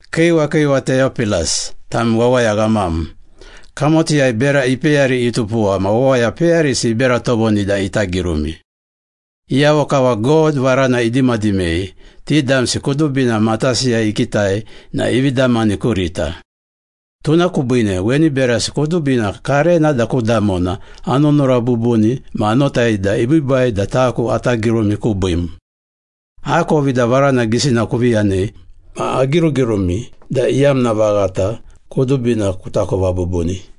Kiiwa kiiwa Teyopilas, tam wawaya ghamam. Kamotiyai bera ipeyari itupuwa ma wawaya peyarisi ibera tovoni da ita girumi. Iyavo kava God varana idimadimei, ti damsi kudubina matasiyai ikitai na ivi damani kurita. Tuna kubiine weni berasi kudubina karena da ku damona anunura bubuni ma anotai da ibiibai da taku ata girumi kubiim. Akovi da varana gisina kuvi yanei ma agirugirumi da iyamna vaghata kudubina kutakova bubuni.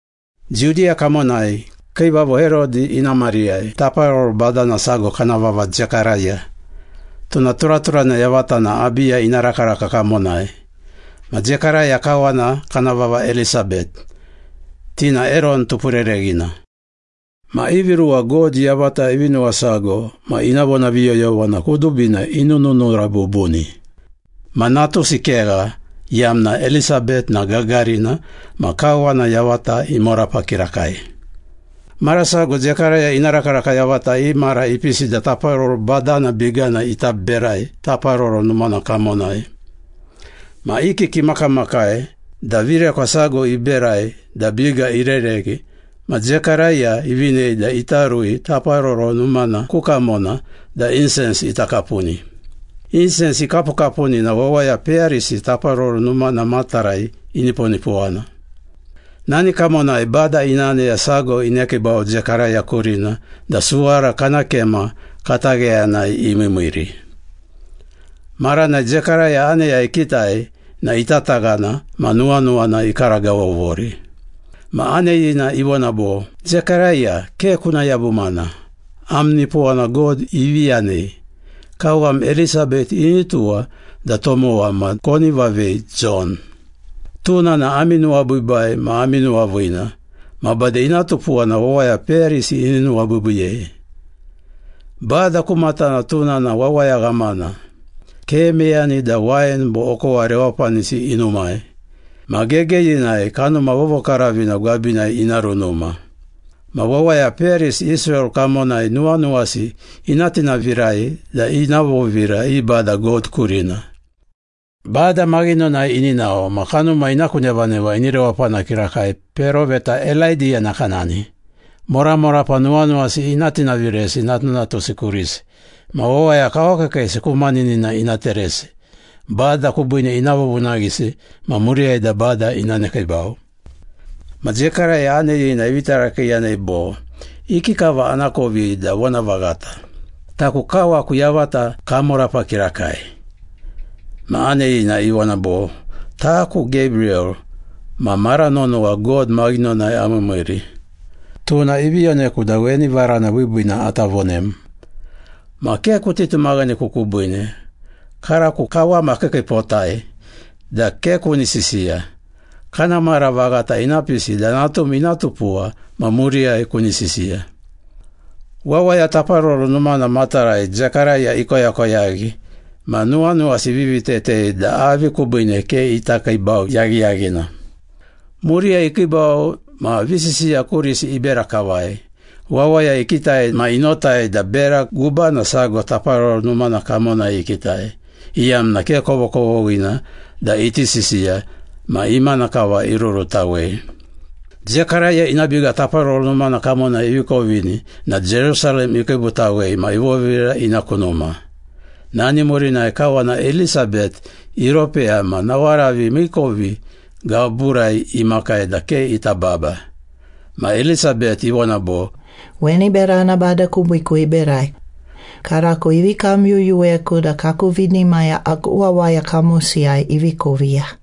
Judiya kamonai, kiivavo Herodi ina mariyai taparoro badana sago kana vava Zekaraya. Tuna turaturana yavata na Abiya ina rakaraka kamonai. Ma Zekaraya kawana kana vava Elisabet. Ti na Eron tupurereghina. Ma ivi ruwa God yavata ivi nuwasago ma ina vonaviyoyovana kudubina inununura bubuni. Ma natusi kegha, iyamna Elisabet na gagarina ma kawana yavata imorapa kirakai. Mara sago Zekaraya ina rakaraka yavata i mara ipisi da taparoro badana bigana ita berai Taparoro Numana kamonai. Ma i kiki imakamakai da virekwa sago iberai da biga irereghi, ma Zekaraya ivinei da ita rui Taparoro Numana ku kamona da insens ita kapuni. Insens ikapukapuni na wawaya peyarisi Taparoro Numana matarai iniponipowana. Nani kamonai Bada ina aneya sago inekiibau Zekaraya kurina da suwara kana kema katagheyanai imiimiiri. Maranai Zekaraya aneya ikitai na itataghana ma nuwanuwana ikaragavovori. Ma aneyina ivona bo, “Zekaraya, ke kuna yabumana. Am nipowana God ivi yanei. Kawam Elisabet ini tuwa da tomowa, ma koni vavei ‘Jon.’ Tuna na ami nuwabiibai ma ami nuwaviina. Ma bade ina tupuwa na wawaya peyarisi ini nuwabiibiiyei. Bada ku matana tuna na wawaya ghamana. Ke meyani da wain bo okowa rewapanisi inumai. Ma gegeyinai Kanuma Vovokaravina gwabinai ina runuma. Ma wawaya peyarisi Israel kamonai nuwanuwasi ina tinavirai da ina vovira i Bada God kurina. Bada maghinonai ini nao, ma kanuma ina ku nevaneva ini rewapana kirakai peroveta Elaidiya nakanani. Moramorapa nuwanuwasi ina tinaviresi natunatusi kurisi. Ma wawaya kawakiikiisi ku maninina ina teresi. Bada kubiine ina vovunaghisi ma muriyai da Bada ina nekiibau.” Ma Zekaraya aneyina ivi tarakiiyanei bo, “Ikikava anakovi da vonavaghata? Taku kawaku yavata kamorapa kirakai.” Ma aneyina ivona bo, “Taku Gebriyel, ma mara nonowa God maghinonai amiimiiri. Tuna ivi yoneku da weni varana biibiina ata vonem. Ma ke kuti tumaghaneku kubiine, karako kawam akiikiipotai da ke kuni sisiya. Kana mara vaghata ina pisi da natum ina tupuwa ma muriyai kuni sisiya.” Wawaya Taparoro Numana matarai Zekaraya ikoyakoyaghi ma nuwanuwasi ivivi tetei da avi kubiine ke ita kiibau yaghiyaghina. Muriyai ikiibau ma visisiya kurisi ibera kavai. Wawaya ikitai ma inotai da bera gubana sago Taparoro Numana kamonai ikitai, iyamna ke kovokovoghina da iti sisiya ma imana kava irurutawei. Zekaraya ina biga Taparoro Numana kamonai ivi kovini na Jerusalem ikiibutawei ma ivovira ina ku numa. Nani murinai kawana Elisabet iropeya ma nawaravi miikovi gaburai imakai da ke ita baba. Ma Elisabet ivona bo, “Weni berana Bada kubiiku iberai. Karako ivi kamyuyuweku da kaku vinimaya aku wawaya kamosiyai ivi koviya.”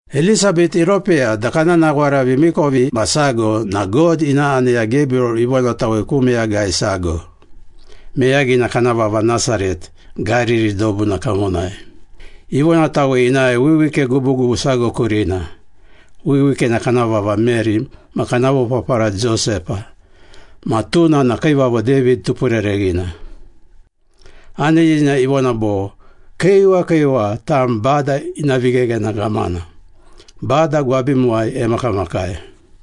Elisabet iropeya da kana nawaravi miikovimasago na God ina aneya Gebriyel ivonatawei ku meyagai sago. Meyagina kana vava Nasaret, Gariri dobuna kamonai. Ivonatawei inae wiwike gubugubu sago kurina, wiwikena kana vava Meri ma kana vopapara Josepa, ma tuna na Kiivavo David tupurereghina. Aneyina ivona bo, “Kiiwa kiiwa, tam Bada ina vigheghena ghamana. Bada gwabimuwai emakamakai.”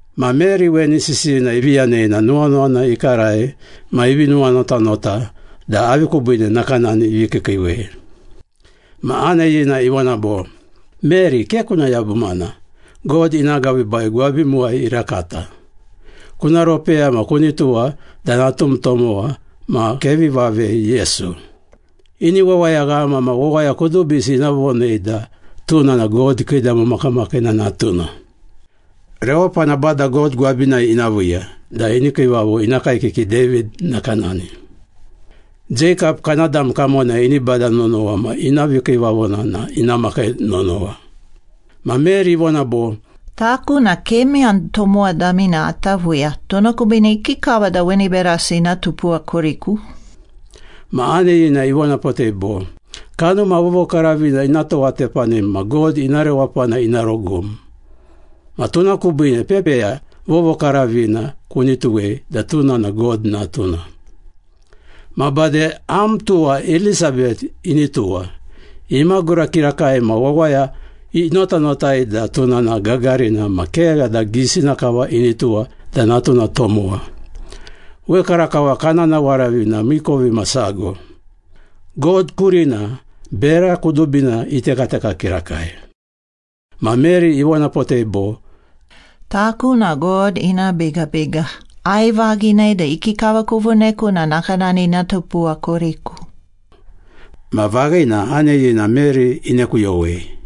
Ma Meri weni sisiyina ivi yanei na nuwanuwana ikarai ma ivi nuwanotanota da avi kubiine nakanani ivi kiikiiwei. Ma aneyina ivona bo, “Meri, ke kuna yabumana. God ina agabiibai gwabimuwai irakata. Kuna ropeya ma kuni tuwa da natum tomowa, ma kevi vavei Yesu. Ini wawayaghama ma wawaya kudubisi ina vonei da tuna na God Kiidamo Makamakiina Natuna. Rewapana Bada God gwabinai ina viiya da ini kiivavo ina kaekiki David nakanani. Jeikap kana dam kamonai ini bada nonowa ma ina vikiivavona na ina makai nonowa.” Ma Meri ivona bo, “Taku na ke meyani tomowa damina ata viiya. Tuna kubiine ikikava da weni berasi ina tupuwa kuriku?” Ma aneyina ivonapotei bo, “Kanuma Vovokaravina ina towatepanim ma God ina rewapana ina rogum. Ma tuna kubiine pepeya vovokaravina kuni tuwei da tuna na God Natuna. Ma bade am tuwa Elisabet ini tuwa. Imagura kirakai ma wawaya inotanotai da tuna na gagarina ma kegha da gisina kava ini tuwa da natuna tomowa. Wekarakava kana nawaravi na miikovimasago. God kurina bera kudubina itekateka kirakai.” Ma Meri ivonapotei bo, “Taku na God ina bigabiga. Aivaghinei da ikikava kuvoneku na nakanani ina tupuwa kuriku.” Ma vaghina, aneyina Meri inekuyowei.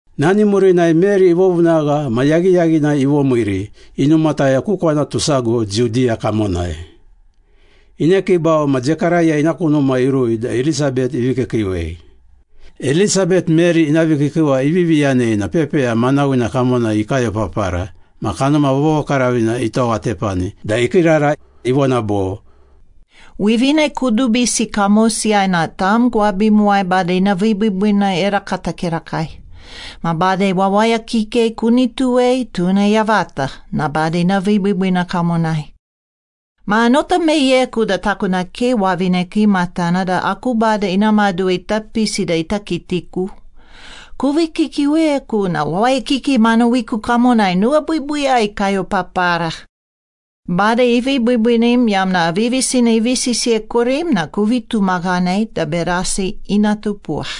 Nani murinai Meri ivovunagha ma yaghiyaghinai ivomiiri, inumataya ku kwanatu sago Judiya kamonai. Inekiibau ma Zekaraya ina ku numa irui da Elisabet ivi kiikiiwei. Elisabet, Meri ina vikiikiiwa ivivi yanei na pepeya manawina kamonai ikayopapara ma Kanuma Vovokaravina itowatepani da ikiirara, ivona bo, “Wivine kudubisi kamosiyai na tam gwabimuwai Bada ina vibiibiina irakata kirakai. Ma bade wawaya kikei kuni tuwei, tuna yavata na Bada ina vibiibiina kamonai. Ma anota meyeku da taku na ke wavine kiimatana da aku Bada ina maduwa ita pisi da ita kitiku. Kuvi kiikiiweku na wawaya kikei manawiku kamonai nuwabiibiiyai ikayopapara. Bada ivi biibiinim iyamna aviyavisina ivi sisiyei kurim na kuvi tumaghanei da berasi ina tupuwa.”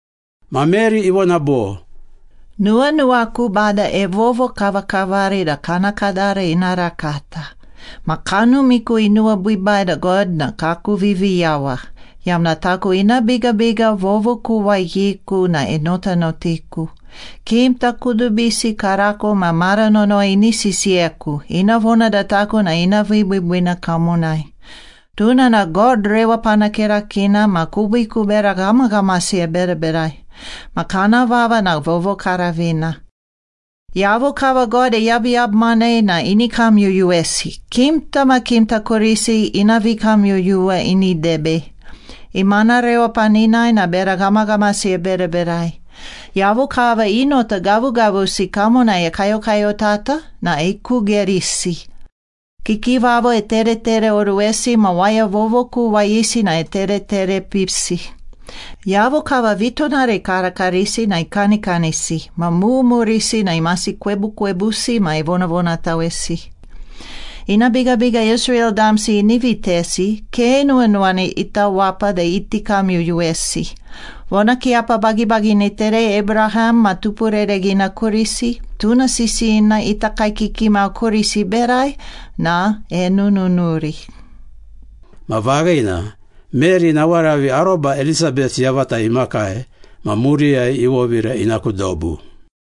Ma Meri ivona bo, “Nuwanuwaku Bada evovokavakavari da kana kadara ina rakata, Ma kanumiku inuwabiibai da God na kaku Viviyawa, Iyamna taku ina bigabiga vovokuwayiku na enotanotiku. Kimta kudubisi karako ma mara nonowa ini sisiyeku, ina vona da taku na ina vibiibiina kamonai. Tuna na God Rewapana Kirakiina ma kubiiku bera ghamaghamasi eberaberai. Ma kana vava na vovokaravina. Iyavo kava God eyabuyabumanei na ini kamyuyuwesi, Kimta ma kimta kurisi ina vikamyuyuwa ini debei. Imana rewapaninai na bera ghamaghamasi eberaberai. Iyavo kava i nota gavugavusi kamonai ekayokayotata na ikugerisi. Kiikiivavo eteretereoruwesi ma wawaya vovokuwayisi na etereterepisi. Iyavo kava vitonara ikarakarisi na ikanikanisi, ma mumurisi na imasi kwebukwebusi ma evonavonatawesi. Ina bigabiga Israel damsi ini vitesi, ke nuwanuwana ita wapa da iti kamyuyuwesi. Vonakiiyapa bagibagina iterei Abraham ma tupurereghina kurisi, Tuna sisiyina ita kaekiki mau kurisi iberai na enununuri.” Ma vaghina, Meri nawaravi aroba Elisabet yavata imakai ma muriyai ivovira ina ku dobu.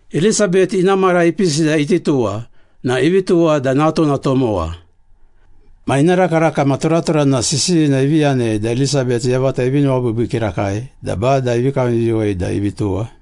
Elisabet ina mara ipisi da iti tuwa na ivi tuwa da natuna tomowa. Ma ina rakaraka ma turaturana sisiyina ivi yanei da Elisabet yavata ivi nuwabiibii kirakai da Bada ivi kamyuyuwei da ivi tuwa.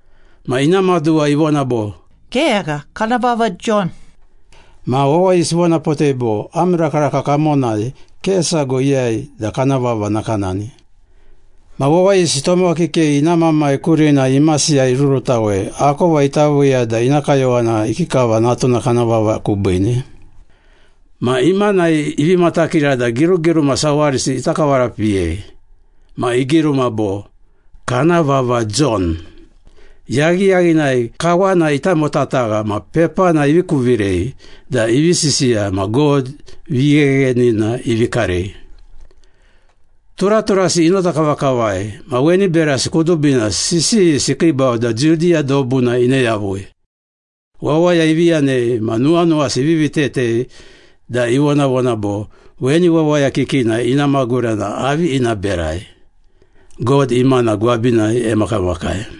Ma ina maduwa ivona bo, “Kegha, kana vava Jon.” Ma wawayisi ivonapotei bo, “Am rakaraka kamonai ke sago iyai da kana vava nakanani.” Ma wawayisi tomowa kikei ina mamai kurina imasiyai irurutawei, akova ita viiya da ina kayowana ikikava natuna kana vava kubiine. Ma imanai ivi matakira da girugiruma sawarisi ita kavarapiyei. Ma igiruma bo, “Kana vava Jon.” Yaghiyaghinai kawana itamotatagha ma pepana ivi kuvirei da ivi sisiya ma God vigheghenina ivi karei. Turaturasi inota kavakavai ma weni berasi kudubina sisiyisi ikiibau da Judiya dobuna ine yavui. Wawaya ivi yanei ma nuwanuwasi ivivi tetei da ivonavona bo, “Weni wawaya kikina ina magura na avi ina berai? God imana gwabinai emakamakai.”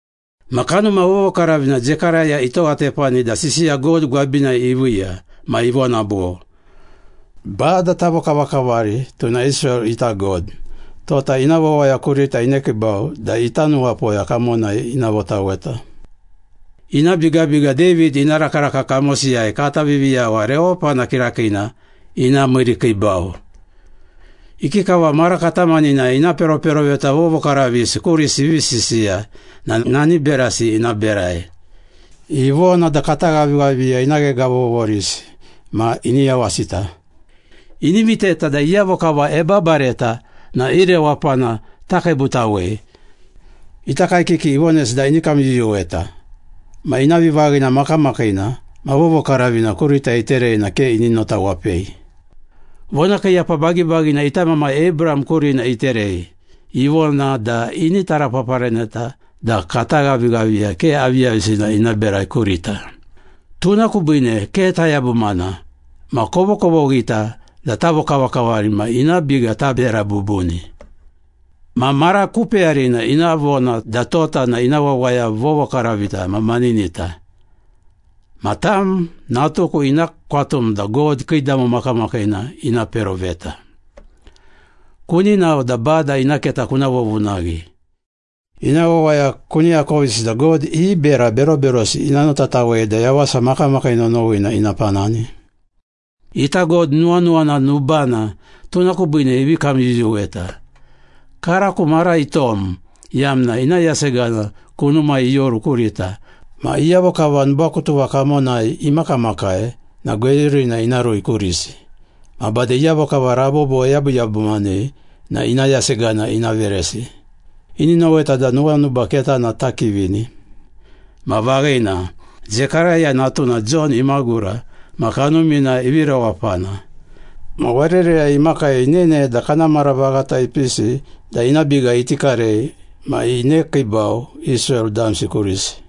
Ma Kanuma Vovokaravina, Zekaraya itowatepani da sisiya God gwabinai iviiya. Ma ivona bo, “Bada tavokavakavari, tuna Israel ita God Tota ina wawaya kurita inekiibau da ita nuwapoya kamonai ina votaweta. Ina bigabiga David ina rakaraka kamosiyai kata Viviyawa rewapana kirakiina ina miirikiibau. Ikikava mara katamaninai ina peroperoveta vovokaravisi kurisi ivi sisiya na nani berasi ina berai. Ivona da kata ghavighaviya ina ghegavovorisi ma ini yawasita. Ini viteta da iyavo kava ebabareta na i rewapana takiibutawei. Ita kaekiki ivonesi da ini kamyuyuweta, Ma ina vivaghina makamakiina ma vovokaravina kurita iterei na ke ini notawapei. Vonakiiyapa bagibagina ita mamai Abraham kurina iterei, Ivona da ini tarapaparaneta da kata ghavighaviya ke aviyavisina ina berai kurita. Tuna kubiine ke tayabumana ma kovokovoghita da tavokavakavari ma ina biga tabera bubuni, Ma mara ku peyarina ina vona da tota na ina wawaya vovokaravita ma maninita. Ma tam, natuku, ina kwatum da God Kiidamo Makamakiina ina peroveta. Kuni nao da Bada ina keta kuna vovunaghi. Ina wawaya kuni akovisi da God i bera beroberosi ina notatawei da yawasa makamakii nonowina ina panani. Ita God nuwanuwana nubana, tuna kubiine ivi kamyuyuweta. Karako mara itom, iyamna ina yasegana kunumai ioru kurita, ma iyavo kava nubakutuva kamonai imakamakai na gweyurina ina rui kurisi, ma bade iyavo kava rabobo eyabuyabumanei na ina yasegana ina veresi, Ini noweta da nuwanuba ketana takivini.” Ma vaghina, Zekaraya natuna Jon imagura ma kanumina ivi rewapana. Ma warereyai imakai inene da kana mara vaghata ipisi da ina biga iti karei ma inekiibau Israel damsi kurisi.